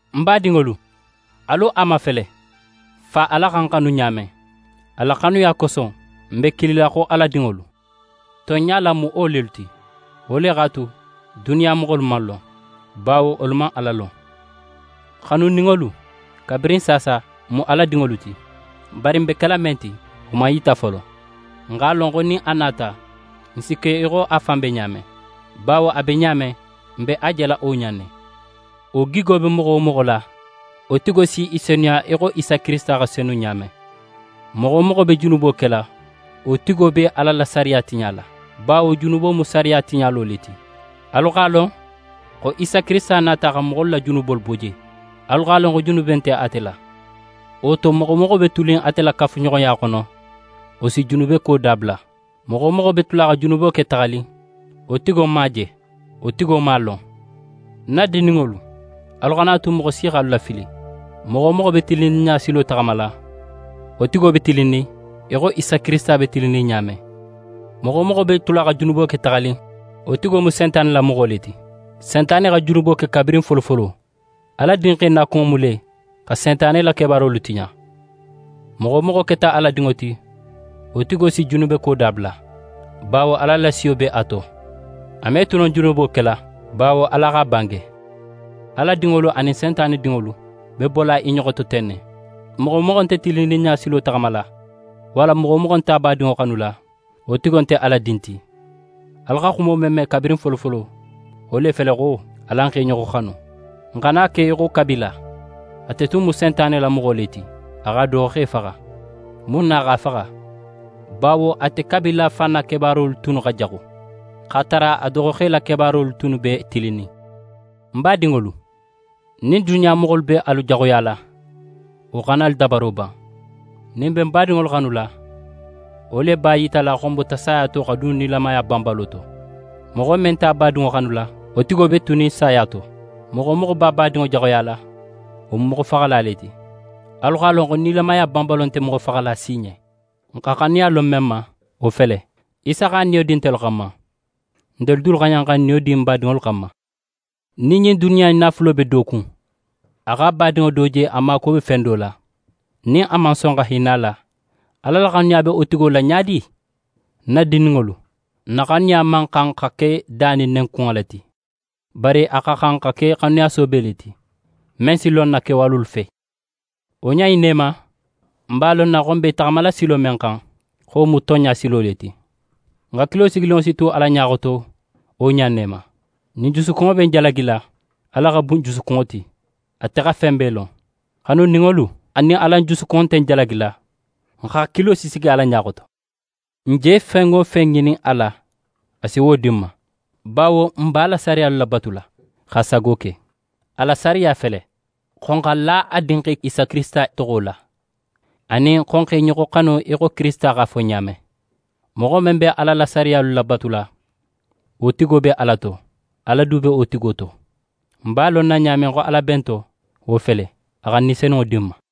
Ń badinŋolu, alu a mafele, Fa Ala xa n xanu ɲa men. A la xanuya koso, n be kilila xo Ala dinŋolu. Tonɲa la, n mu wo lelu ti. Wo le x'a tu, duniya moxolu man n lon, bawo wolu man Ala lon. Xanuninŋolu, kabirin saasa, n mu Ala dinŋolu ti. Bari n be kela men ti, wo man yita folo. N x'a lon xo nin a nata, n si ke í xo a fan be ɲa men, bawo a be ɲa men, n be a jela wo ɲa in ne. Wo gigo be moxo wo moxo la, wo tigo si í senuya í xo Isa Kirisita xa senu ɲa men. Moxo wo moxo be junubo kela, wo tigo be Ala la sariya tiɲala, bawo junubo mu sariya tiɲalo le ti. Alu x'a lon xo Isa Kirisita nata xa moxolu la junubolu bo je. Alu x'a lon xo junube nte ate la. Wo to, moxo wo moxo be tunin ate la kafuɲoxoya xono, wo si junubeko dabula. Moxo wo moxo be tula xa junubo ke taxanin, wo tigo man a je, wo tigo man a lon. Ń na dindinŋolu, alu xana a tu moxo si x'alu lafili! Moxo wo moxo be tilinninɲa silo taxamala, wo tigo be tilinnin í xo Isa Kirisita be tilinnin ɲa men. Moxo wo moxo be tula xa junubo ke taxanin, wo tigo mu Sentane la moxo le ti. Sentane xa junubo ke kabirin folofolo. Ala Dinxe nakunŋo mu le xa Sentane la kebaarolu tiɲa. Moxo wo moxo keta Ala dinŋo ti, wo tigo si junubeko dabula, bawo Ala la siyo be a to, a me tu no junubo kela, bawo Ala x'a bange. Ala dinŋolu anin Sentane dinŋolu be bola i ɲoxo to ten ne: Moxo wo moxo nte tilinninɲa silo taxamala, walla moxo wo moxo nte a badinŋo xanula, wo tigo nte Ala din ti. Alu xa xumo men me kabirin folofolo, wo le fele xo: Alan x'e ɲoxo xanu. N xana ke í xo Kabila. Ate tun mu Sentane la moxo le ti. A x'a doxoxe faxa. Mun na a x'a faxa? Bawo ate Kabila fan na kebaarolu tunnu xa jaxu, x'a tara a doxoxe la kebaarolu tunnu be tilinnin. Ń badinŋolu, nin duniya moxolu be alu jaxuyala, wo xana alu dabaro ban. Nin n be n badinŋolu xanula, wo le b'a yitala xo n bota saya to xa dun nilamaya banbalo to. Moxo men nte a badinŋo xanula, wo tigo be tunin saya to. Moxo wo moxo be a badinŋo jaxuyala, wo mu moxofaxala le ti. Alu x'a lon xo nilamaya banbalo nte moxofaxala si ɲen. N xa xanuya lon men ma, wo fele: Isa x'a niyo di ntelu xanma, ntelu dulu xa xan xa n niyo di n badinŋolu xanma. Nin ɲin duniya in naafulo be do kun, a x'a badinŋo do je a maakuwo be fen do la, nin a man son xa hinna a la, Ala la xanuya be wo tigo la ɲa di? Ń na dindinŋolu, n na xanuya man xan xa ke da nin nenkunŋo la ti. Bari a xa xan xa ke xanuya soobe le ti, men si lon n na kewalolu fe. Wo ɲa in ne ma, n b'a lonna xo n be i taxamala silo men xan, xo wo mu tonɲa silo le ti. N hakilo sigininŋo si tu Ala ɲa xoto wo ɲa in ne ma. Nin n jusukunŋo be n jalagila, Ala xa bun n jusukunŋo ti; ate xa fen bee lon. Xanuninŋolu, nin alan jusukunŋo nte n jalagila, n hakilo si sigi Ala ɲa xoto. N je fen wo fen ŋinin a la, a si wo di n ma, bawo n b'a la sariyalu labatula, x'a sago ke. A la sariya fele: Xo n xa la a Dinxe Isa Kirisita toxo la, anin xo n x'e ɲoxo xanu í xo Kirisita x'a fo n ɲen ɲa men. Moxo men be Ala la sariyalu labatula, wo tigo be Ala to, Ala du be wo tigo to. N b'a lonna ɲa men xo Ala be n to, wo fele: A xa Ni Senunŋo di n ma.